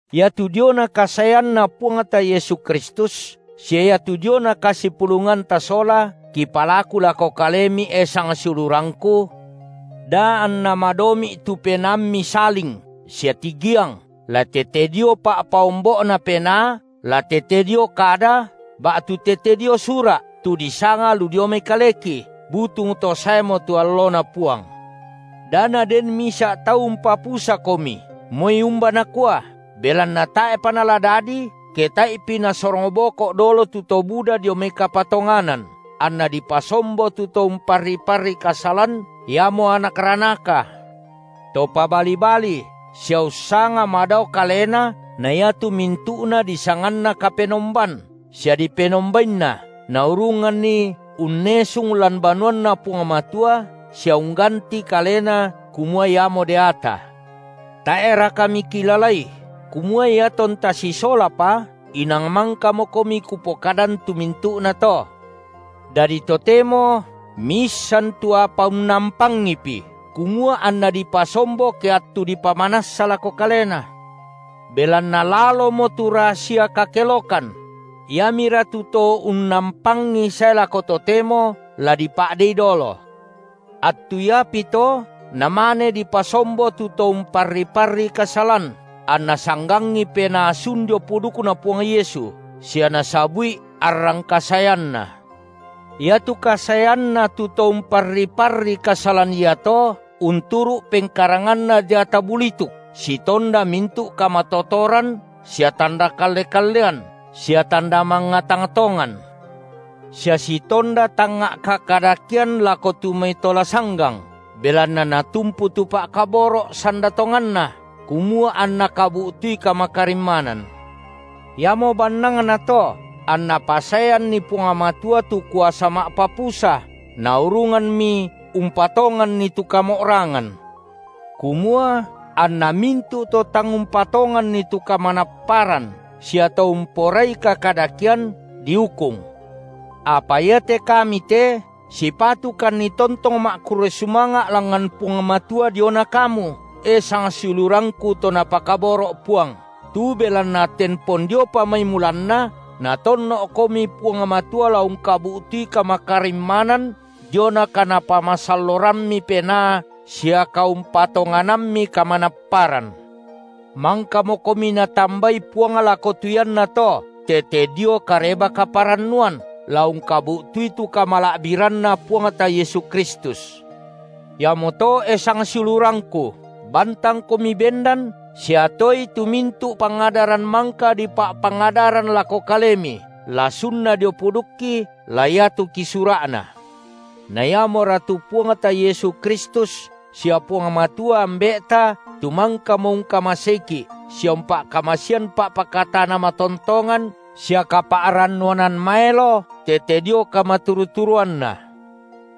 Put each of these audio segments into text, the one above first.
Iatu diona kasaeanNa Puangta Yesu Kristus, sia iatu diona kasipulunganta sola, kipalaku lako kalemi, e sang siulurangku, da anna madomi’ tu penaammi saling sia tigiang, la tete dio pa’paombo’na penaa, la tete dio kada, ba’tu tete dio sura’, tu disanga lu dio mai kaleki, butung to saemo tu alloNa Puang. Da naden misa’ tau umpapusakomi moi umba nakua, belanna tae’pa nala dadi, ke tae’pi nasorong boko’ dolo tu to buda dio mai kapatonganan, anna dipasombo tu to umparri-parri kasalan, iamo anak ranaka, to pabali-bali sia ussanga madao kalena na iatu mintu’na disanganna kapenomban sia dipenombainna, naurunganni unnesung lan banuanNa Puang Matua sia ungganti kalena kumua iamo deata. Tae’raka mikilalai kumua iatonta sisolapa inang mangkamokomi kupokadan tu mintu’nato? Dadi totemo miissan tu apa unnampangipi, kumua anna dipasombo ke attu dipamanassa lako kalena. Belanna lalomo tu rasia kakelokan; iamira tu to unnampangi sae lako totemo la dipa’dei dolo. Attu iapito namane dipasombo tu to umparri-parri kasalan, anna sanggangi penaa sun dio pudukNa Puang (Yesu) sia nasabu’i arrang kasaeanNa. Iatu kasaeanna tu to umparri-parri kasalan iato unturu’ pengkaranganna deata bulituk sitonda mintu’ kamatotoran sia tanda kalle-kallean sia tanda mangnga tang tongan, sia sitonda tangnga’ kakadakean lako tu mai to la sanggang, belanna natumpu tu pa’kaboro’ sanda tonganna, kumua anna kabu’tui kamakarimmanan. Iamo bannangnato anNa pasaeanni Puang Matua tu kuasa ma’papusa, naurunganmi umpatonganni tu kamo’rangan, kumua anna mintu’ to tang umpatonganni tu kamanapparan sia to umporai kakadakean, diukung. Apa iate kami te sipatukanni tontong ma’kurre sumanga’ langngan Puang Matua diona kamu, e sangsiulurangku to Napakaboro’ Puang, tu belanna tempon diopa mai mulanna Natonno’komi Puang Matua la ungkabu’tui kamakarimmanan diona kaNapamasallorammi Penaa sia kaumpatonganammi kamanapparan. Mangkamokomi Natambai Puang lako tu iannato tete dio Kareba-kaparannuan, la ungkabu’tui tu kamala’biranNa Puangta Yesu Kristus. Iamoto, e sangsiulurangku, bantangkomi bendan sia toei tu mintu’ pangadaran mangka dipa’pangadaran lako kalemi, la sunna dio pudukki, la iatu kisura’na. Na iamora tu Puangta Yesu Kristus, sia Puang Matua, Ambe’ta, tu mangkamo ungkamaseiki’ sia umpa’kamasean pa’pakatana matontongan sia kapa’rannuanan maelo tete dio kamaturu-turuanNa,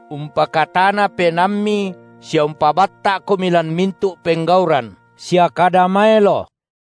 umpakatana penaammi sia umpabatta’komi lan mintu’ penggauran sia kada maelo.